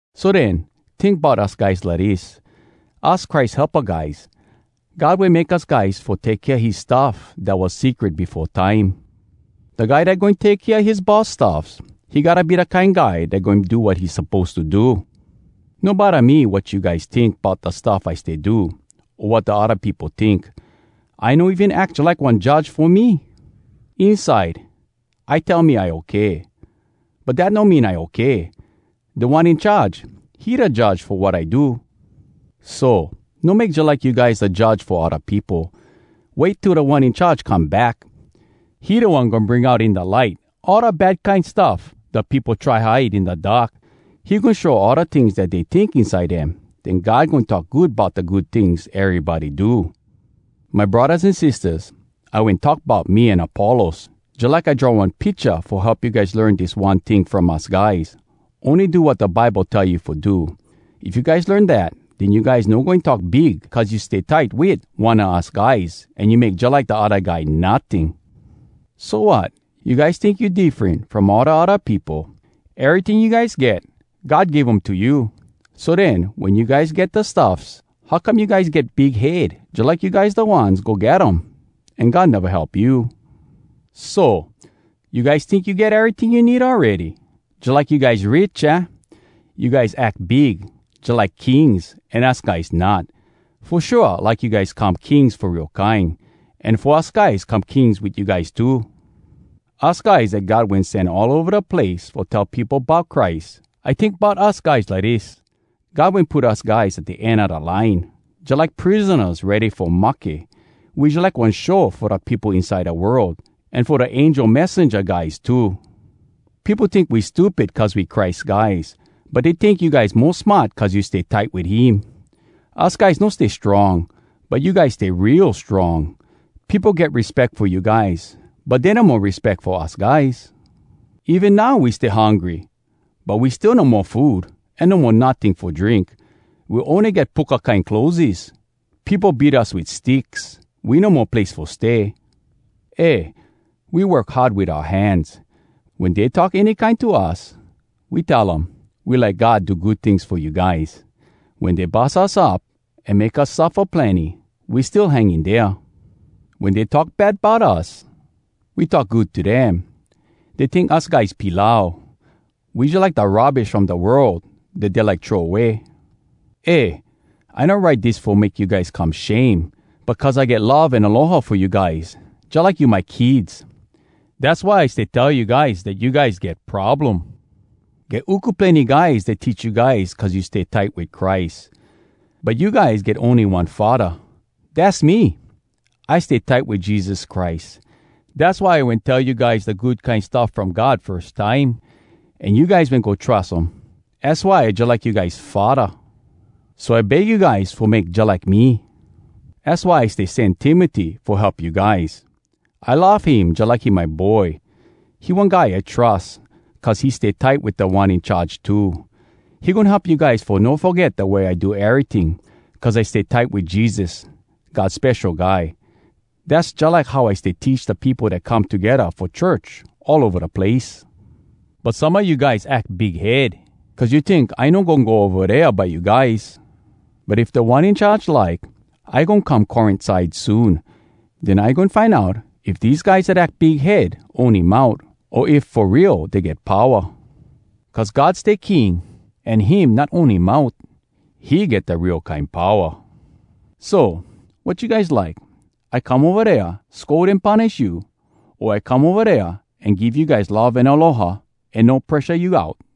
So den, tink bout us guys lidis: Us Christ helpa guys. God wen make us guys fo take kea his stuff dat was secret befo time. Da guy dat goin take kea his boss stuffs, he gotta be da kine guy dat goin do wat he suppose to do. No bodda me wat you guys tink bout da stuff I stay do, o wat da odda peopo tink. I no even ack jalike one judge fo me. Inside, I tell me I okay, but dat no mean I okay. Da One In Charge, he da judge fo wat I do. So, no make jalike you guys da judge fo odda peopo. Wait till Da One In Charge come back. He da One goin bring out in da light all da bad kine stuff da peopo try hide in da dark. He goin show all da tings dat dey tink inside dem. Den God goin talk good bout da good tings erybody do. My braddahs an sistahs, I wen talk bout me an Apollos, jalike I draw one picha fo help you guys learn dis one ting from us guys: Ony do wat da Bible tell you fo do. If you guys learn dat, den you guys no goin talk big cuz you stay tight wit one a us guys an you make jalike da odda guy notting. So, wat? You guys tink you diffren from all da odda peopo? Eryting you guys get, God give um to you. So den, wen you guys get da stuffs, how come you guys get big head, jalike you guys da ones go get um an God neva help you? So! You guys tink you get eryting you need awready! Jalike you guys rich, aah? You guys ack big, jalike kings, an us guys not! Fo shua, I like you guys come kings fo real kine, an fo us guys come kings wit you guys too! Us guys dat God wen sen all ova da place fo tell peopo bout Christ. I tink bout us guys lidis: God wen put us guys at da end a da line, jalike prisonas ready fo mahke. We jalike one show fo da peopo inside da world, an fo da angel messenja guys too. Peopo tink we stupid cuz we Christ guys, but dey tink you guys mo smart cuz you stay tight wit him! Us guys no stay strong, but you guys stay real strong! Peopo get respeck fo you guys, but dey no mo respeck fo us guys. Even now we stay hungry, but we still no mo food an no mo notting fo drink. We ony get puka kine clotheses. Peopo beat us wit sticks. We no mo place fo stay. Eh, we work hard wit oua hands. Wen dey talk any kine to us, we tell um, “We like God do good tings fo you guys.” Wen dey bus us up an make us suffa plenny, we still hang in dea. Wen dey talk bad bout us, we talk good to dem. Dey tink us guys pilau. We jalike da rubbish from da world dat dey like throw way. Eh! I no write dis fo make you guys come shame, but cuz I get love an aloha fo you guys jalike you my kids. Dass why I stay tell you guys dat you guys get problem. Get uku plenny guys dat teach you guys cuz you stay tight wit Christ. But you guys get ony one faddah, dass me! I stay tight wit Jesus Christ, dass why I wen tell you guys da Good Kine Stuff From God firs time, an you guys wen go trus um. Az why I jalike you guys faddah. So I beg you guys fo make jalike me. Az why I stay sen Timoty fo help you guys. I love him jalike he my boy. He one guy I trus, cuz he stay tight wit Da One In Charge too. He goin help you guys fo no foget da way I do eryting cuz I stay tight wit Jesus, God Spesho Guy. Dass jalike how I stay teach da peopo dat come togedda fo church all ova da place. But some a you guys ack big head, cuz you tink I no goin go ova dea by you guys. But if Da One In Charge like, I goin come Corint side soon. Den I goin find out if dese guys dat ack big head ony mout, o if fo real dey get powa! Cuz God stay king, an him not ony mout. He get da real kine powa. So, wat you guys like? I come ova dea scold an punish you? O I come ova dea, an give you guys love an aloha an no presha you out?